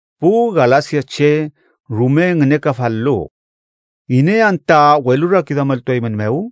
¡Pu galasiache rume ngünekafal-lu! ¿Iney anta welurakiduameltueymünmew?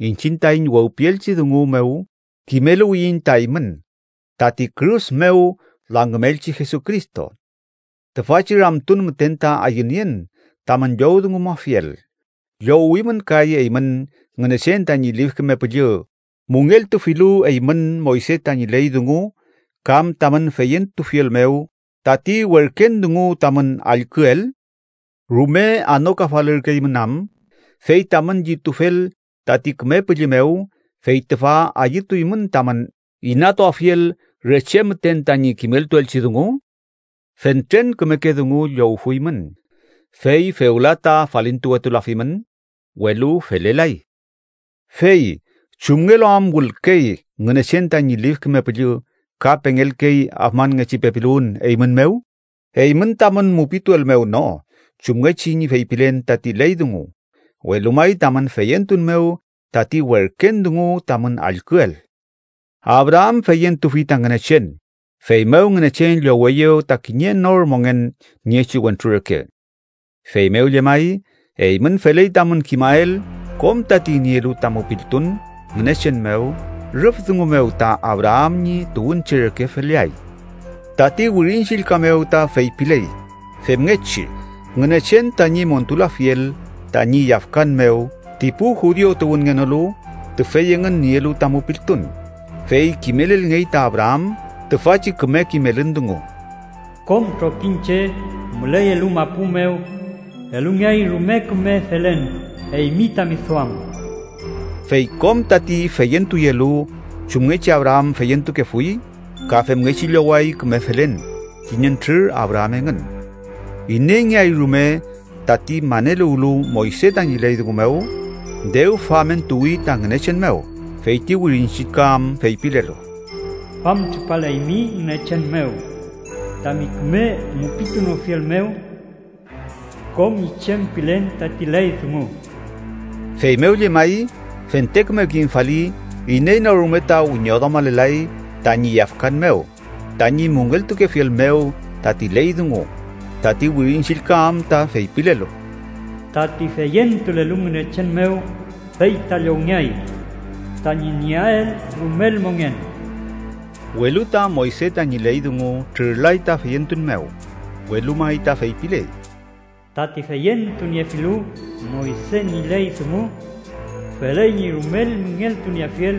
Iñchiñ taiñ wewpielchi dungu mew kimeluwiyiñ ta eymün tati kürus mew langümelchi Jesucristo. Tüfachi ramtun müten ta ayünien tamün llowdungumuafiel: ¿Llowimün kay eymün Ngünechen tañi Lif Küme Püllü müngeltufilu eymün Moyse tañi ley dungu kam tamün feyentufiel mew tati werken dungu tamün allküel? ¿Rume anokafalürkeymün am, fey tamün llitufel tati Küme Püllü mew, fey tüfa ayütuymün tamün inatuafiel re che müten tañi kimeltuelchi dungu? Fentren kümeke dungu llowfuymün, ¿fey fewla ta falintuwetulafimün? Welu felelay. Fey ¿chumngelu am wülkey Ngünechen tañi Lif Küme Püllü ka pengelkey afmanngechi pepiluwün eymün mew? Eymün tamün mupituel mew no chumngechi ñi feypilen tati ley dungu, welu may tamün feyentun mew tati werken dungu tamün allküel. “Abraam feyentufi ta Ngünechen, feymew Ngünechen lloweyew ta kiñe nor mongen niechi wentru reke.” Feymew llemay, eymün feley tamün kimael kom tati nielu ta mupiltun Ngünechen mew rüf dungu mew ta Abraam ñi tuwünche reke feleay. Tati Wirin Chillka mew ta feypiley femngechi Ngünechen tañi montulafiel tañi yafkan mew ti pu judiu tuwünngenolu tüfey engün nielu ta mupiltun, fey kimelelngey ta Abraam tüfachi küme kimelün dungu: “Kom trokiñche müleyelu mapu mew elungeay rume küme felen eymi tami duam.” Fey kom tati feyentuyelu chumngechi Abraam feyentukefuy ka femngechi lloway küme felen kiñentrür Abraam engün. Ineyngeay rume tati maneluwlu Moyse tañi ley dungu mew, dew famentuwi ta Ngünechen mew, fey ti Wirin Chillka am feypilelu: “famtripaleymi Ngünechen mew tami küme mupitunofiel mew kom ñi chem pilen tati ley dungu.” Feymew llemay, fente küme kimfali iney no rume ta wiñoduamalelay tañi yafkan mew tañi müngeltukefiel mew tati ley dungu, tati Wirin Chillka am ta feypilelu: “tati feyentulelu Ngünechen mew fey ta llowngeay tañi nieael rumel mongen.” Welu ta Moyse tañi ley dungu trürlay ta feyentun mew, welu may ta feypiley: “Tati feyentuniefilu Moyse ñi ley dungu, feley ñi rumel müngeltunieafiel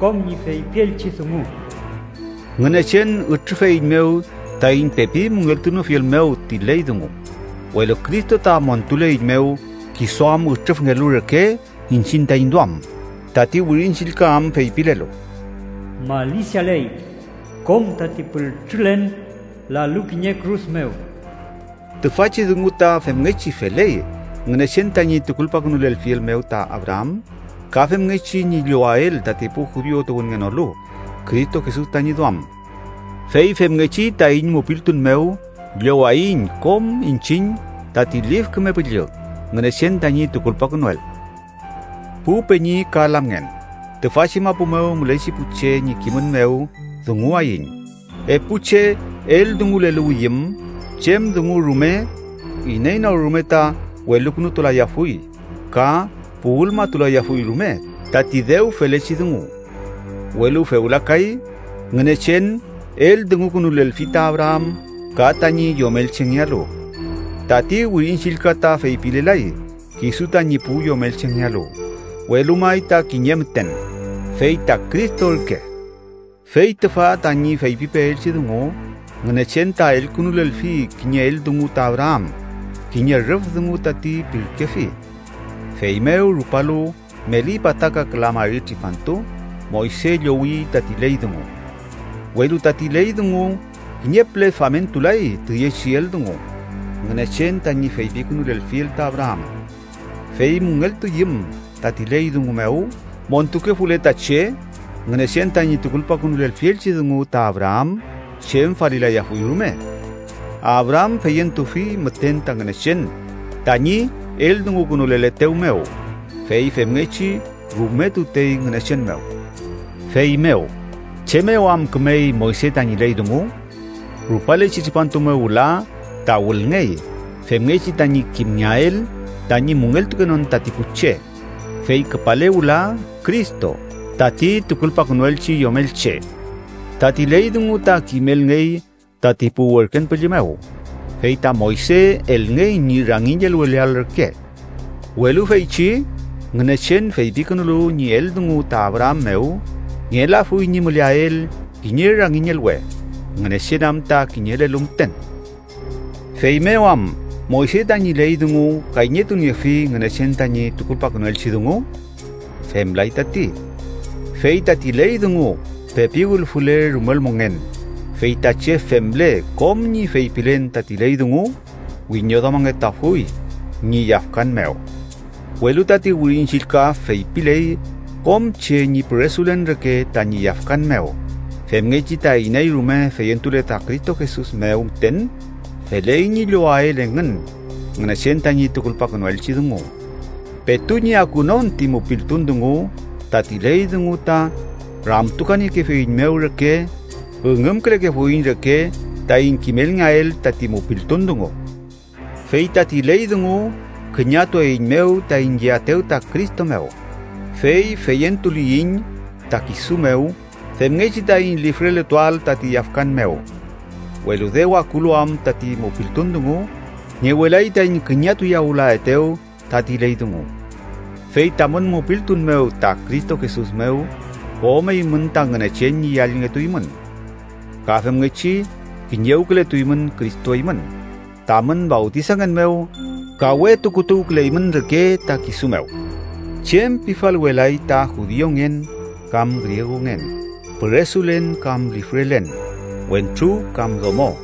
kom ñi feypielchi dungu.” Ngünechen ütrüfeiñmew taiñ pepi müngeltunofiel mew ti ley dungu, welu Cristo ta montuleiñmew, kisu am ütrüfngelu reke iñchiñ taiñ duam, tati Wirin Chillka am feypilelu: “Malisialey kom tati pültrülen lalu kiñe kürus mew.” Tüfachi dungu ta femngechi feley Ngünechen tañi tukulpakünulelfiel mew ta Abraam ka femngechi ñi llowael tati pu judiu tuwünngenolu, Cristo Jesus tañi duam. Fey femngechi taiñ mupiltun mew llowaiñ kom iñchiñ tati Lif Küme Püllü Ngünechen tañi tukulpakünuel. Pu peñi ka lamngen, tüfachi mapu mew mülechi pu che ñi kimün mew dunguwayiñ: epu che eldunguleluwiyüm chem dungu rume, iney no rume ta welukünutulayafuy ka puwülmatulayafuy rume tati dew felechi dungu. Welu fewla kay, Ngünechen eldungukünulelfi ta Abraam ka tañi yomelchengealu. Tati Wirin Chillka ta feypilelay “kisu tañi pu yomelchengealu, welu may ta kiñe müten”, fey ta Cristo ürke. Fey tüfa tañi feypipeelchi dungu: Ngünechen ta elkünulelfi kiñe eldungu ta Abraam, kiñe rüf dungu tati pirkefi. Feymew rupalu meli pataka küla mari tripantu, Moyse llowi tati ley dungu. Welu tati ley dungu kiñe püle famentulay tüyechi eldungu Ngünechen tañi feypikünulelfiel ta Abraam. Fey müngeltuyüm tati ley dungu mew montukefule ta che, Ngünechen tañi tukulpakünulelfielchi dungu ta Abraam chem falilayafuy rume. Abraam feyentufi müten ta Ngünechen tañi eldungukünuleletew mew, fey femngechi rume tutey Ngünechen mew. Feymew, ¿chem mew am kümey Moyse tañi ley dungu? Rupalechi tripantu mew wüla ta wülngey femngechi tañi kimngeael tañi müngeltukenon tati pu che, fey küpale wüla Cristo tati tukulpakünuelchi yomelche. Tati ley dungu ta kimelngey tati pu werken püllü mew, fey ta Moyse elngey ñi rangiñelweleael reke. Welu feychi Ngünechen feypikünulu ñi eldungu ta Abraam mew, ngelafuy ñi müleael kiñe rangiñelwe, Ngünechen am ta kiñelelu müten. Feymew am ¿Moyse tañi ley dungu kayñetuniefi Ngünechen tañi tukulpakünuelchi dungu? ¡Femlay tati! Fey tati ley dungu pepi wülfule rumel mongen, fey ta che femle kom ñi feypilen tati ley dungu, wiñoduamangetuafuy ñi yafkan mew. Welu tati Wirin Chillka feypiley kom che ñi püresulen reke tañi yafkan mew, femngechi ta iney rume feyentule ta Cristo Jesus mew müten feley ñi llowael engün Ngünechen tañi tukulpakünuelchi dungu. Petu ñi akunon ti mupiltun dungu, tati ley dungu ta rakümtukuniekefeiñmew reke, üngümkülekefuiñ reke taiñ kimelngeael tati mupiltun dungu. Fey tati ley dungu küñatueiñmew taiñ yeaetew ta Cristo mew, fey feyentuliyiñ ta kisu mew femngechi taiñ lifreletuael tati yafkan mew. Welu dew akulu am tati mupiltun dungu, ngewelay taiñ küñatuyawülaetew tati ley dungu. Fey tamün mupiltun mew ta Cristo Jesus mew, kom eymün ta Ngünechen ñi yallngetuymün, ka femngechi kiñewkületuymün Cristo eymün tamün fawtisangen mew ka we tukutuwküleymün reke ta kisu mew. Chem pifalwelay ta judiungen kam griegungen, püresulen kam lifrelen, wentru kam domo,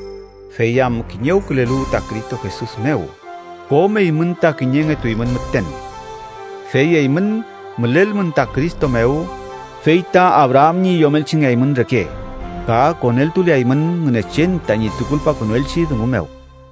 fey am kiñewkülelu ta Cristo Jesus mew, kom eymün ta kiñengetuymün müten. Fey eymün mülelmün ta Cristo mew, fey ta Abraam ñi yomelchengeaymün reke ka koneltuleaymün Ngünechen tañi tukulpakünuelchi dungu mew.